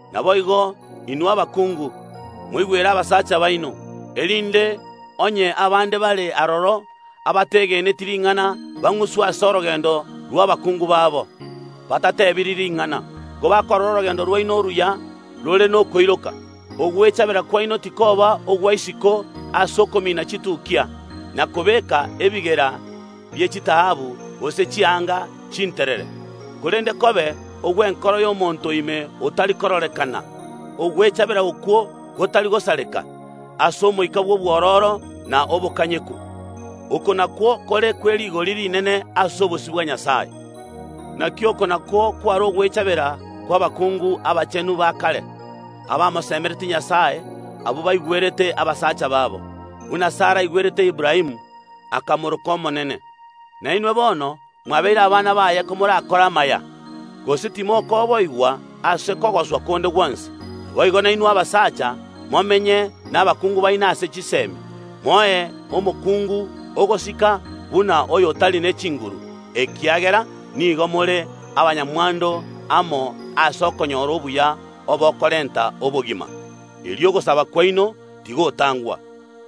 Naboigo, inwe abakungu, moigwere abasacha baino, erinde onye abande bare aroro, abategeneti ring’ana, bang’uswe ase orogendo rw’abakungu babo, batatebiri ring’ana, kobakorora orogendo rwaino oruya rore nokoiroka. Ogwechabera kwaino tikoba ogwa isiko ase okomina chitukia, na kobeeka ebigera bie chitaabu, gose chianga chinterere, korende kobe ogw’enkoro y’omonto o ime otari kororekana, ogwechabera okwo gotari gosareka, ase omoika bw’obwororo na obokanyeku. Oko nakwo kore kwe rigori rinene ase obosio bwa Nyasae. Naki oko nakwo kware ogwechabera kw’abakungu abachenu ba kare, abamosemeretie Nyasae, abwo baigwerete abasacha babo, buna Sara aigwerete Aburaamu, akamoroka omonene. Na inwe bono mwabeire abana baye komorakore amaya, gose timokwoboigwa ase kogoswa konde gwonsi. Naboigo nainwe abasacha, momenye nabakungu baino ase chisemi. Moe omokungu ogosika buna oyo otari ne chinguru, ekiagera nigo more abanyamwando amo ase okonyora obuya obokorenta obogima. Erio ogosaba kwaino tigotangwa.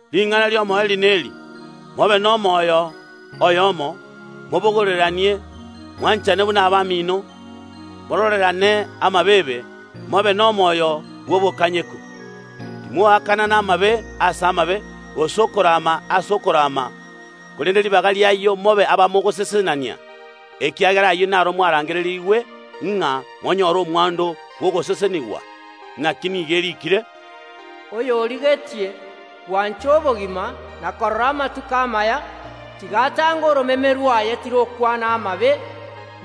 Ring’ana ri’omoerio neri: Mobe nomoyo oyomo, mobogoreranie, mwanchane buna abamino, mororerane amabeebe, mobe nomoyo bw’obokanyeku. Timoakanana amabe ase amabe, gose okorama ase okorama, korende ribaga ri’ayio mobe abamogosesenania, ekiagera ayio naro mwarangererigwe, ng’a monyore omwando bw’ogosesenigwa. Naki nigo eriikire “Oyorigetie gwancha obogima na korora amatuko amaya, tiga atange oromeme rwaye tirokwana amabe,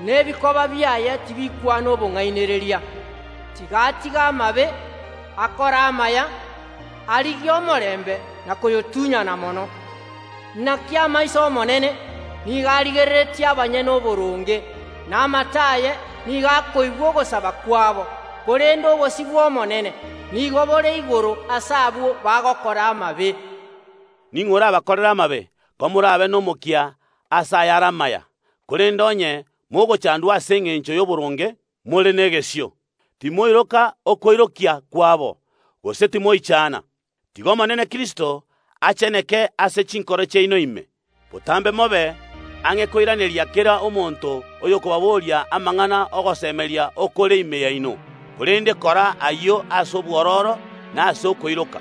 na ebikoba biaye tibikwana obong’ainereria. Tiga atige amabe, akore amaya, arigie omorembe na koyotunyana mono. Naki amaiso Omonene nigo arigereretie abanyene oboronge, na amato aye nigo akoigwa ogosaba kwabo. Korende obosio bw’Omonene nigo bore igoro ase abwo bagokora amabe.” Ning’o orabakorere amabe, komorabe nomokia ase ayare amaya? Korende onye mogochandwa ase engencho y’oboronge, more negesio. Timoiroka okoirokia kwabo, gose timoichana. Tiga Omonene Kristo acheneke ase chinkoro chiaino ime. Botambe mobe ang’e koiraneria kera omonto oyokobaboria amang’ana ogosemeria okore ime yaino, korende kora ayio ase obwororo na ase okoiroka.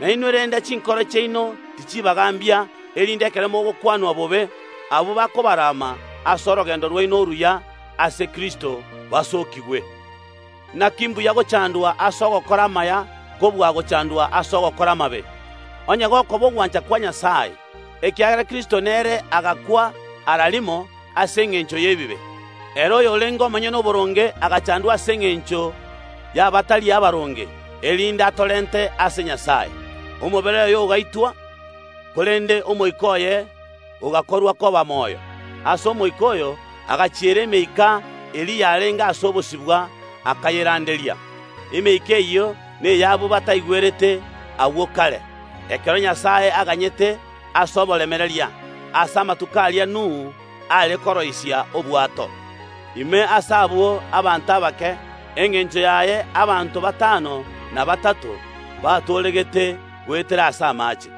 Na inwe renda chinkoro chiaino tichibagambia, erinde ekero mogokwanwa bobe, abwo bakobarama ase orogendo rwaino oruya ase Kristo, basookigwe. Naki mbuya gochandwa ase ogokora amaya kobua gochandwa ase ogokora amabe, onye gokoba ogwancha kwa Nyasae. Ekiagera Kristo nere agakwa ara rimo ase engencho y’ebibe. Ere oyorenge omonyene oboronge agachandwa ase engencho y’abatari abaronge, erinde atorente ase Nyasae. Omobere oye ogaitwa, korende omoika oye ogakorwa koba moyo. Ase omoika oyo agachiera emeika eria yarenge ase obosibwa, akayeranderia. Emeika eyio ney’abwo bataigwerete agwo kare, ekero Nyasae aganyete ase oboremereria ase amatuko aria Nuhu are koroisia obwato. Ime ase abwo abanto abake, engencho yaye abanto batano na batato, batooregete goetera ase amache.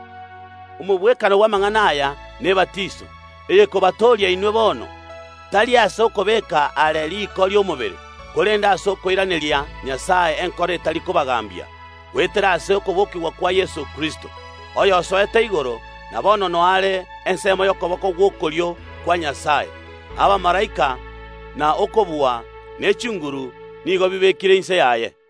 Omogwekano bw’amang’ana aya nebatiso, eyekobatooria inwe bono, tari ase okobeeka aare riko ri’omobere, korende ase okoiraneria Nyasae enkoro etari kobagambia, goetera ase okobokigwa kwa Yeso Kristo, oyosoete igoro, na bono nao are ensemo y’okoboko gw’okorio kwa Nyasae. Abamalaika, na okobua, ne chinguru nigo bibekire inse yaye.